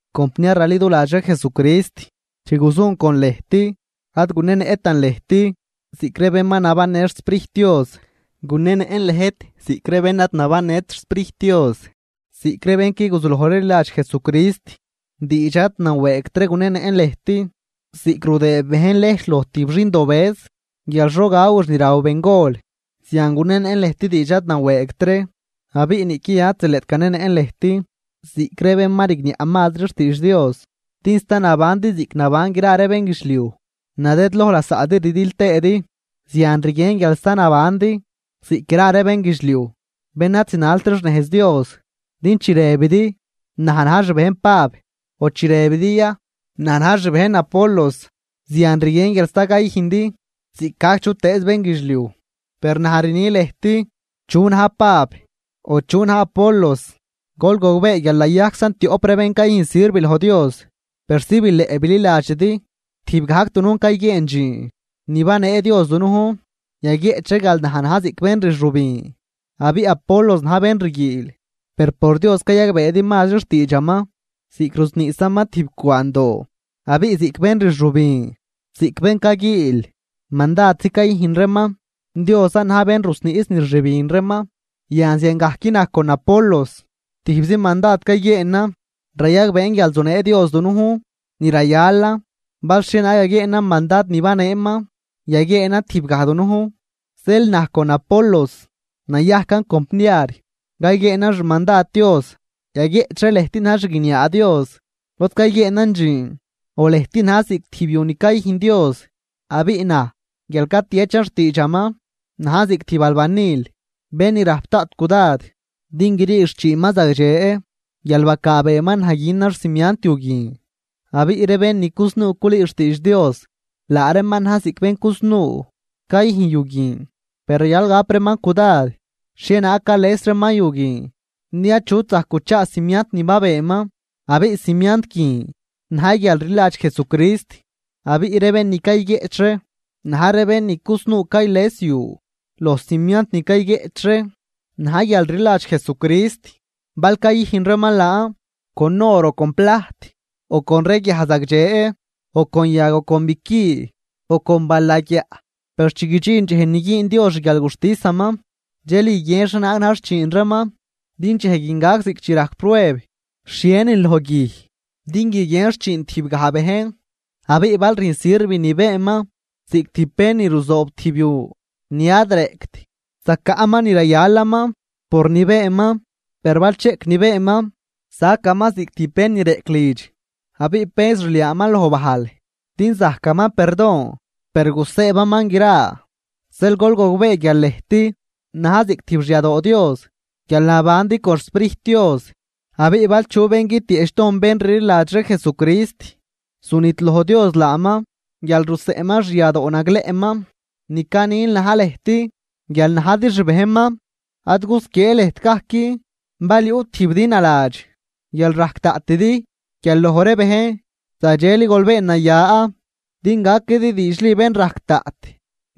Compniar raliduladx ree Jesucrist, chi guzun con lëjt ad gunenëꞌtan lëjt ziꞌc ree bén ma nabannë xSprijt Dios, gunenëꞌn lëjt ziꞌc ree bén ad nabannët xSprijt Dios, ziꞌc ree bén qui guzulojri rliladx Jesucrist. Diidx ad nawëëgt ree gunenëꞌn lëjt ziꞌc rudëë bejn lejch loj tijb xindobëz guial xo gawix ni raw bengol, zian gunenëꞌn lëjt diidx ad nawëëgt ree. Abiꞌ niꞌqui yan ad zileꞌt ganenëꞌn lëjt ziꞌc ree bén ma rigniaꞌ mazri xtiidx Dios. Din sta nabandi ziꞌc naban gra ree bénguidxliuj. Nadëdloj lasaꞌdi rdil tëëdi, zian rguien guial sta nabandi ziꞌc gra ree bénguidxliuj bén ad zinalt ree xnejz Dios. Din chi rëbidi: “Naj na̱j xbejn Pab”, o chi rëbidi ya: “Naj na̱j xbejn Apolos”, zian rguien guial sta cayüjndi ziꞌcgajc chutëëz bénguidxliuj. Per naj rni lëjt: ¿Chu na̱j Pab o chu na̱j Apolos? Gol gogbee guial nayajczan tioꞌp ree bén cayüjn sirv loj Dios persi bileꞌ bililadxidi tijb gajc dunujn cayguieen dxiin ni banee Dios dunujn. Yaguieꞌch ree guial naj na̱j ziꞌc bén rxübin abiꞌ Apolos na̱j bén rguiil, per por Dios cayagbeedi mazri xtiidxaman ziꞌc rusniꞌsaman tijb cwaandoo. Abiꞌ ziꞌc bén rxübin ziꞌc bén caguiil mandadzi cayüjn reeman, Diosan na̱j bén ni rusniꞌs ni rxübin reeman. Yan ziangajc naj con Apolos tijbzi mandad cayguieenan, rayagbeen guial zunee Dios dunujn ni rayalan bal xhienaag yaguieenan mandad ni baneeman yaguieen tijb gaj dunujn. Zeel naj con Apolos nayajcan compniar cayguieenan xmandad Dios. Yaguieꞌch ree lëjt na̱j xguiniaa Dios lod cayguieenan dxiin o lëjt na̱j ziꞌc tijb yu ni cayüjn Dios. Abiꞌ naj guial catiechan xtiidxaman najn ziꞌc tijb albanil bén ni rajp daꞌt cudad din grii xchiinman zagdxe guial bacaabeeman naj günan xcimiant yu guin. Abiꞌ ree bén ni cusnuu culüü xtiidx Dios, laa reeman na̱j ziꞌc bén cusnuu cayüjn yu guin. Per rayal gap reeman cudad xhienaag cales reeman yu guin, din achut zajc guchaa cimiant ni ma benan, abiꞌ cimiant guin na̱j guial rliladx Jesucrist. Abiꞌ ree bén ni cayguieꞌch ree na̱j ree bén ni cusnuu cales yu loj cimiant ni cayguieꞌch ree na̱j guialrliladx Jesucrist, bal cayüjn reeman laan con or o con plajt o con ree guiaj zagdxe o con yag o con biqui o con balagyaꞌ. Per chi guidxin dxej ni güün Dios xguialguxtisaman, dxel guiguien xhienaag na̱j xchiin reeman. Din dxej guin gac ziꞌc chi rajc prueb xhienin loj guij din guiguien xchiin tijb gaj bejn. Abiꞌ bal rüjn sirv ni beenman ziꞌc tijb bén ni ruzoob tijb yu ni ad reꞌct, zacaꞌman ni rayalaman por ni beenman. Per bal cheꞌc ni beenman, sacaman ziꞌc tijb bén ni reꞌc lidx abiꞌ penz rliaaman loj bajl, din zajcaman perdon per gusëëbaman gra. Zeel gol gogbee guial lëjt na̱j ziꞌc tijb xyadoo Dios guial nabandi con xSprijt Dios. Abiꞌ bal chu bén guitieꞌchdojn bén rliladx ree Jesucrist, zunidloj Dios laaman guial ruseꞌnman xyadoo nagleꞌman ni canin na̱j lëjt guial najdi xbejnman. Ad gusquiee lëjt gajc. Bal yuꞌ tijbidi naladx guial rajc daꞌtidi guial loj ree bejn, zagdxeli gol been naya din gaquidi diidxli bénrajc daꞌt.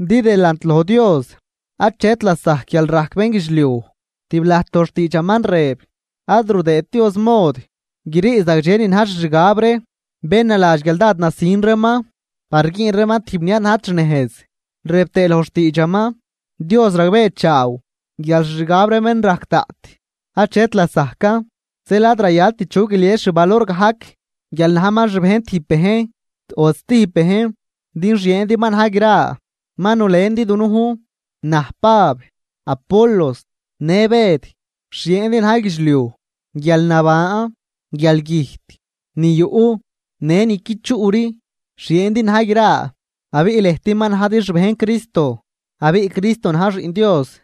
Din delant loj Dios achet lasajc guialrajc bénguidxliuj, tib lajt loj xtiidxaman rëb: “Ad rudëët Dios mod grii zagdxe ni na̱j xixgab ree bén naladx guial dád nasin reeman par güün reeman tijb ni ad najt xnejz.” Rëb tëë loj xtiidxaman: “Dios ragbeechaaw guial xixgab ree bén rajc daꞌt achet lasajcan.” Zeel ad rayalt chu guilies xvalor gajc guial najman xbejn tijb bejn o stijb bejn. Din xieendi ma na̱j gra. Ma nulendi dunujn, na̱j Pab, Apolos në Bëd. Xieendi na̱j guidxliuj, guialnaban, guialgüjt, ni yuꞌ, në ni qui chuꞌri, xieendi na̱j gra. Abiꞌ lëjt ma najdi xbejn Cristo abiꞌ Cristo na̱j Xiꞌn Dios.